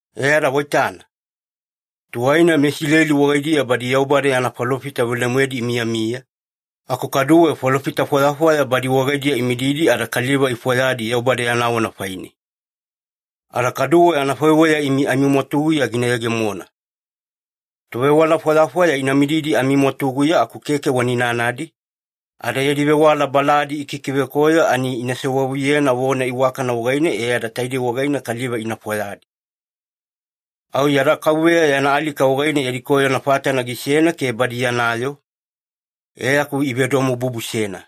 E ada waitana, tuwaina meIsileli wagaidiya badi Yaubada yana falofita velemoedi imiyamiya, aku kaduwe falofita fwayafwaya badi wagaidiya imididi ada kaliva ifwayadi Yaubada yana vona faine. Ada kaduwe anafaiweya imi amimwatuguya gina yegemona. Tovewala fwayafwaya ina mididi amimwatuguya aku keke wana inanadi, ada yadi vewala baladi ikikivekoyo ani ina sewavuyena vona iwakana wagaine e ada taidei wagaine kaliva ina fwayadi. Au yada Kauveya yana alika wagaine yadi koyona fatana gisena ke badi yana yoo, e aku ivedomobubusena.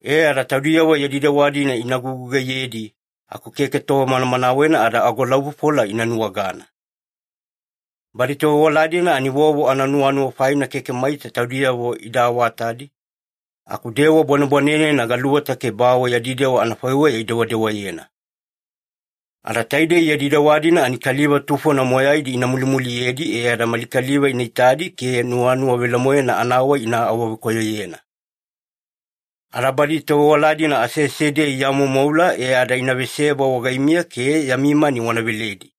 E ada taudiyavo yadi dewa-dina ina gugugaiyedi aku keke tova manamanawena ada agolaufofola ina nuwagana. Badi tovewala-dina ani vovo ananuwanuwa faina keke maita taudiyavo ida awatadi, aku dewa bwanebwanenena galuweta ke bawe yadi dewa anafaiweya idewadewayena. Ada taidei yadi dewa-dina ani kaliva tufona moyaidi ina mulimuliyedi, e ada mali kaliva ina itadi ke nuwanuwa velemoena anawai ina awavekoyoyena. Ada badi tovewala-dina aseasediya iamoumoula e ada ina veseba wagaimiya ke yami mani wana veledi.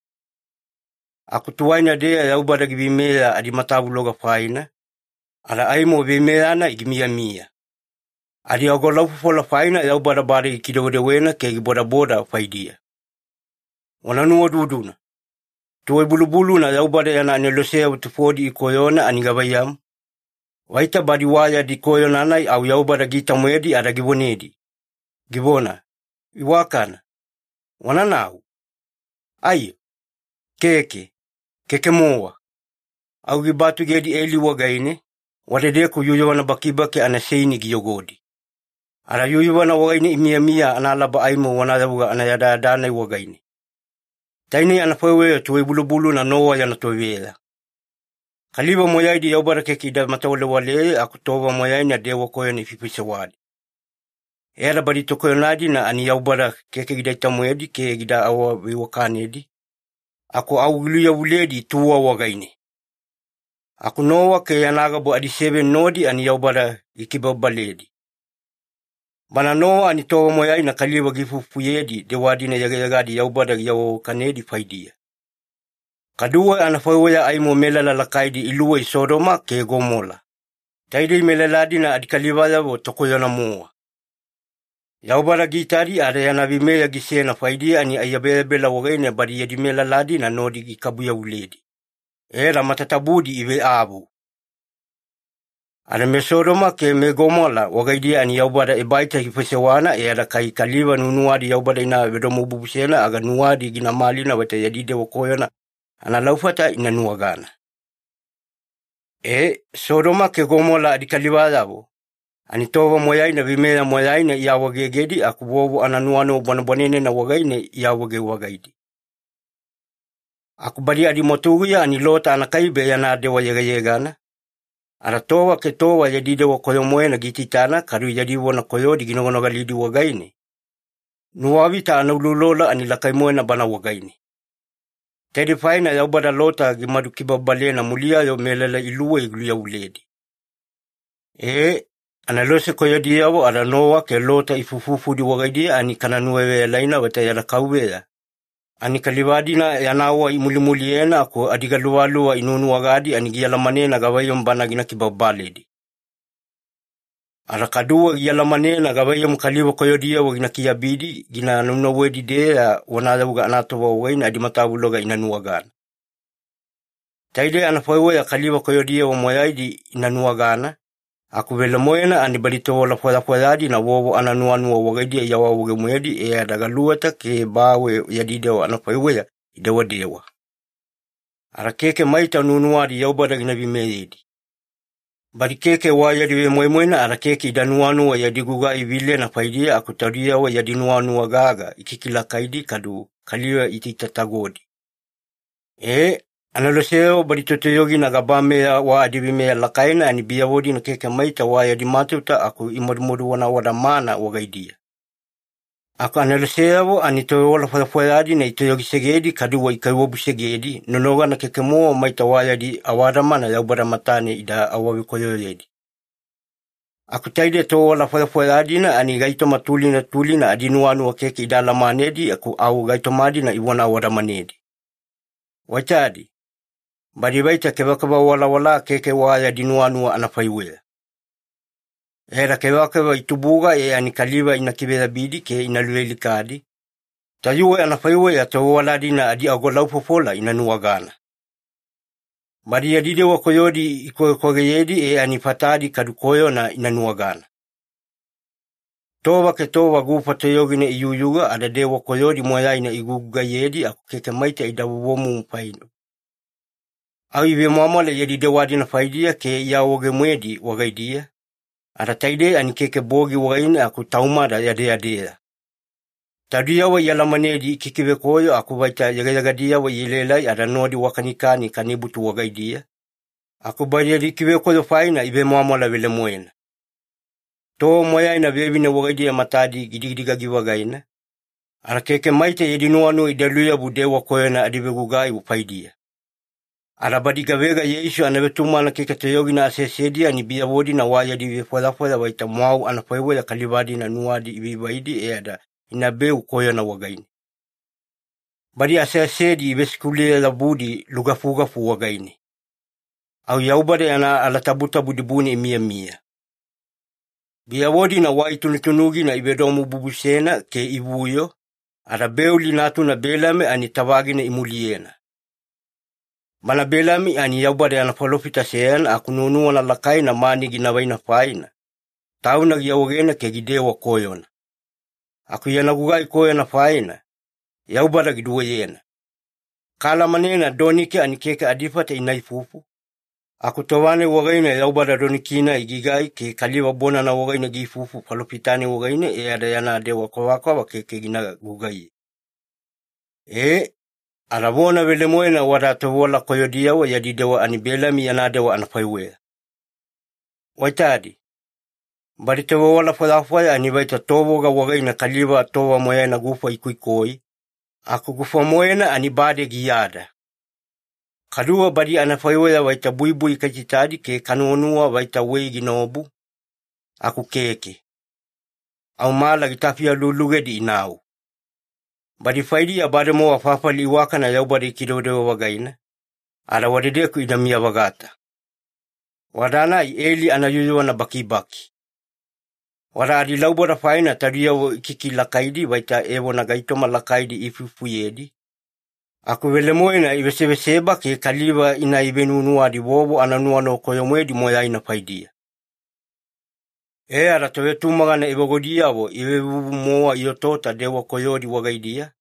Aku tuwaina-deya Yaubada giveimeya adimatavuloga faina, ada aimo veimeya-nai gimiyamiya. Adiagolaufofola faina Yaubada bade gikidewedewena ke gibodaboda faidiya. Wana nuwaududuna. Tuwai-bulubuluna Yaubada yana aneloseyavo tufodi ikoyona ani gavaiyamu? Vaita badi wa yadi koyona-nai au Yaubada giita-moedi ada givonedi, givona, “Iwakana, wananau?” Aiyo? Keke, keke-mowa. Au gibatugedi eli wagaine, wadedeku yuyuvana bakibaki anaseini giyogodi. Ada yuyuvana wagaine imiyamiya analaba aimo vonayavuga anayadayada-nai wagaine. Tainei anafaiweya tuwai-bulubuluna Nowa yana toveya. Kaliva moyaidi Yaubada keke ida matawalewaleye aku tova moyaina dewa koyona ifaifaisewadi. E ada badi tokoyona-dina ani Yaubada keke gidaita-moedi ke gida awaveiwakanedi, aku au giluyavuledi tuwa wagaine. Aku Nowa ke yana gabu adiseveni nodi ani Yaubada gikibababaledi. Bana Nowa ani tova moyaina kaliva giifuifufuyedi dewa-dina yegayegadi Yaubada giawaveiwakanedi faidiya. Kaduwe anafaiweya aimo melala lakaidi iluwei Sodoma ke Gomola, taidei melala-dina adikalivayavo tokoyona-mowa. Yaubada giitadi ada yana veimeya gisena faidiya ani aiyabeyabela wagaine badi yadi melala-dina nodi gikabu-yavuledi, e ada matatabudi iveavu. Ada meSodoma ke meGomola wagaidiya ani Yaubada ebaita gifaisewana e ada kai kaliva nuwanuwadi Yaubada ina vedomobubusena, aga nuwadi gina malina vaita yadi dewa koyona analaufata ina nuwagana. E, Sodoma ke Gomola adikalivayavo, ani tova moyaina veimeya moyaina iawaegegedi aku vovo ananuwanuwa bwanebwanenena wagaine iawaege-vagaidi. Aku badi adimwatuguya ani Lota anakaibe yana dewa yegayegana, ada tova ke tova yadi dewa koyo-moena giitaitana kadu yadi vona koyodi ginoganogalidi wagaine, nuwavita anauloulolo ani lakai-moena bana wagaine. Taidei faina Yaubada Lota gimadu kibababalena muliya-yo melala iluwei giluyavuledi. Ee, anelose koyodiyavo ada Nowa ke Lota ifuifufudi wagaidiya ani kana nuwaveyalaina vaita yada Kauveya ani kaliva-dina yana wai imulimuliyena aku adigaluvaluva inuwanuwagadi ani gialamanena gavaiyamu Bana gina kibababaledi. Ada kaduwe gialamanena gavaiyamu kaliva koyodiyavo gina kiabidi gina naunauwedi-deya vonayavuga anatova wagaine adimatavuloga ina nuwagana. Taidei anafaiweya kaliva koyodiyavo moyaidi ina nuwagana, aku velemoena ani badi tovewala fwayafwaya-dina vovo ananuwanuwa wagaidiya iawaawaege-moedi e ada galuweta ke bawe yadi dewa anafaiweya idewadewa. Ada keke maita nuwanuwadi Yaubada gina veimeyedi. Badi keke wa yadi vemoimoina ada keke ida nuwanuwa yadi gugai vilena faidiya, aku taudiyavo yadi nuwanuwa gaga ikikilakaidi kadu kaliva iitaitatagodi. Ee, aneloseyavo badi totoyogidi gabameya wa adiveimeya lakaina, ani biyavo-dina keke maita wa yadi matauta aku imadumaduvona awadamana wagaidiya. Aku aneloseyavo ani tovewala fwayafwaya-dina itoyogisegedi kaduwe ikaiwabusegedi, nonogana keke-mowa maita wa yadi awadamana Yaubada matane ida awavekoyoyedi. Aku taide tovewala fwayafwaya-dina, ani gaitoma tulina tulina adinuwanuwa keke ida alamanedi aku au gaitoma-dina ivona awadamanedi. Waitadi, badi vaita kevakeva walawala keke wa yadi nuwanuwa anafaiweya. E ada kevakeva itubuga e ani kaliva ina kiveyabidi ke ina luvealikadi, tayuwe anafaiweya tovewala-dina adiagolaufofola ina nuwagana. Badi yadi dewa koyodi ikwagekwageyedi e ani fatadi kadu koyona ina nuwagana. Tova ke tova gufa toyogina iyuyuga ada dewa koyodi moyaina igugugaiyedi aku keke maita ida vovomumu faine. Au ivemwamwala yadi dewa-dina faidiya ke iawaawege-moedi wagaidiya, ada taidei ani keke bogi wagaine aku taumada yadeyadeya. Taudiyavo ialamanedi ikikivekoyo aku vaita yegayegadiyavo ielaelai ada nodi wakanikani kanibutu wagaidiya, aku badi yadi kivekoyo faina ivemwamwala velemoena. Tova moyaina vevine wagaidiya matadi gidigagi-vagaina, ada keke maita yadi nuwanuwa ida luyabu dewa koyona adivegugai faidiya. Ada badi gavega Yeisu anavetumagana keke toyogina aseasediya, ani biyavo-dina wa yadi vefwayafwaya vaita mwau anafaiweya kaliva-dina nuwadi ivaivaidi e ada inabeu koyona wagaine. Badi aseasedi ivesikuluye-yabudi lugafugafu wagaine. Au Yaubada yana alatabutabu dibune imiyamiya. Biyavo-dina wai tunutunugina ivedomobubusena ke ivuyo, ada Beoli natuna Belami ani tavagina imuliyena. Bana Belami ani Yaubada yana falofita seyana aku nuwanuwana lakaina mani gina vaina faina, tauna giawaegena ke gidewa koyona. Aku yana gugai koyona faina, Yaubada giduweyena. Kaalamanena doniki ani keke adifata ina ifufu, aku tova-nai wagaine Yaubada doniki-nai gigai ke kaliva bonana wagaine giifufu falofita-nai wagaine e ada yana dewa kwavakwava keke gina gugaiye. Ee, ada vona velemoena wada tovewala koyodiyavo yadi dewa ani Belami yana dewa anafaiweya. Waitadi, badi tovewala fwayafwaya ani vaita tovoga wagaine kaliva tova moyaina gufa ikoikoi, aku gufa-moena ani bade giyada. Kaduwe badi anafaiweya vaita buibui kaitaitadi ke kanuwanuwa vaita wei ginaobu, aku keke. Au mala gitafi alualugedi inau. Badi faidiya bademowa fafali iwakana Yaubada gikidewedewe-vagaina, ada wadedeku inamiya-vagata. Wada-nai eli anayuyuvana bakibaki. Wada adilauboda faina taudiyavo ikikilakaidi vaita evona gaitoma lakaidi iifuifufuyedi, aku velemoena iveseveseba ke kaliva ina ivenuwanuwadi vovo ananuwanuwa koyo-moedi moyaina faidiya. E ada tovetumagana evagudiyavo ivevuvu-mowa iotaota dewa koyodi wagaidiya,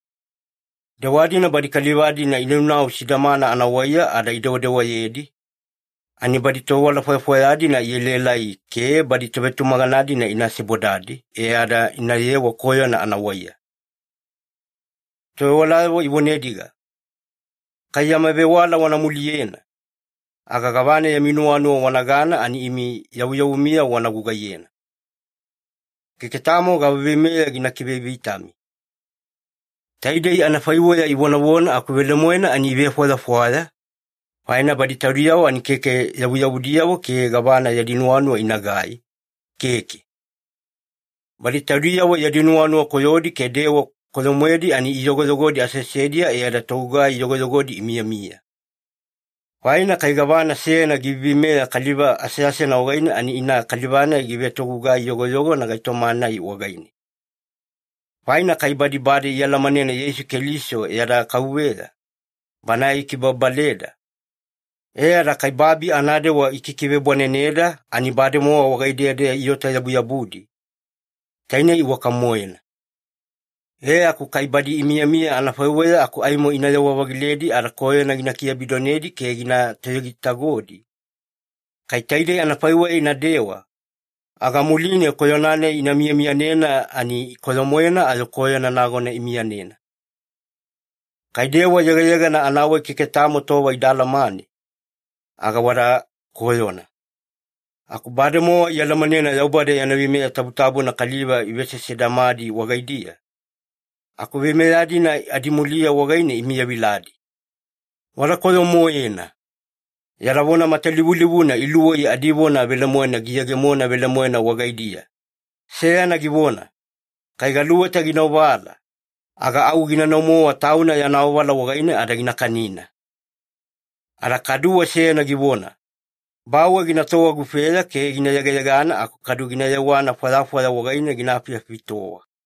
dewa-dina badi kaliva-dina inaunau sidamana anawaiya ada idewadewayedi, ani badi tovewala fwayafwaya-dina ielaelai ke badi tovetumagana-dina ina sebodadi, e ada inayewa koyona anawaiya. Tovewalayavo ivonediga, “Kai yama vewala wana muliyena, aga gavana yami nuwanuwa wanagana ani imi yavuyavumiyavo wana gugaiyena. Keke tamo gava veimeya gina kivevitami.” Taidei anafaiweya ivonavona aku velemoena ani ivefwayafwaya, faina badi taudiyavo ani keke yavuyavudiyavo ke gavana yadi nuwanuwa inagai, keke. Badi taudiyavo yadi nuwanuwa koyodi ke dewa koyo-moedi ani iyogoyogodi aseasediya, e ada togugai yogoyogodi imiyamiya. Faina kai gavana seyana giveiveimeya kaliva aseasena wagaine, ani ina kaliva-nai givetogugai-yogoyogona gaitoma-nai wagaine. Faina kai badi bade ialamanena Yeisu Keliso yada Kauveya, Banae gikibababaleda, e ada kai babi anadewa ikikivebwaneneda ani bademowa wagaidiya-deya iota-yabuyabudi, taine iwaka-moena. E aku kai badi imiyamiya anafaiweya aku aimo inayewa-vagiledi ada koyona gina kiabidonedi ke gina toyogitagodi, kai taidei anafaiweya inadewa, aga muline koyona-nai ina miyamiyanena ani koyo-moena ayo koyona nagona imiyanena. Kai dewa yegayegana anawai keke tamo tova ida alamane, aga wada koyona. Aku bademowa ialamanena Yaubada yana veimeya tabutabuna kaliva ivesesevedamadi wagaidiya, aku veimeya-dina adimuliya wagaine imiyaviladi. Wada koyo-moena! Yada vona matalivulivuna iluwei adivona velemoena giyegemona velemoena wagaidiya. Seyana givona, “Kai galuweta gina ovala, aga au ginanau-mowa tauna yana ovala wagaine ada gina kanina.” Ada kaduwe seyana givona, “Bawe ginatowa gufeya ke gina yegayegana aku kadu gina yewana fwayafwaya wagaine gina afiafitowa.”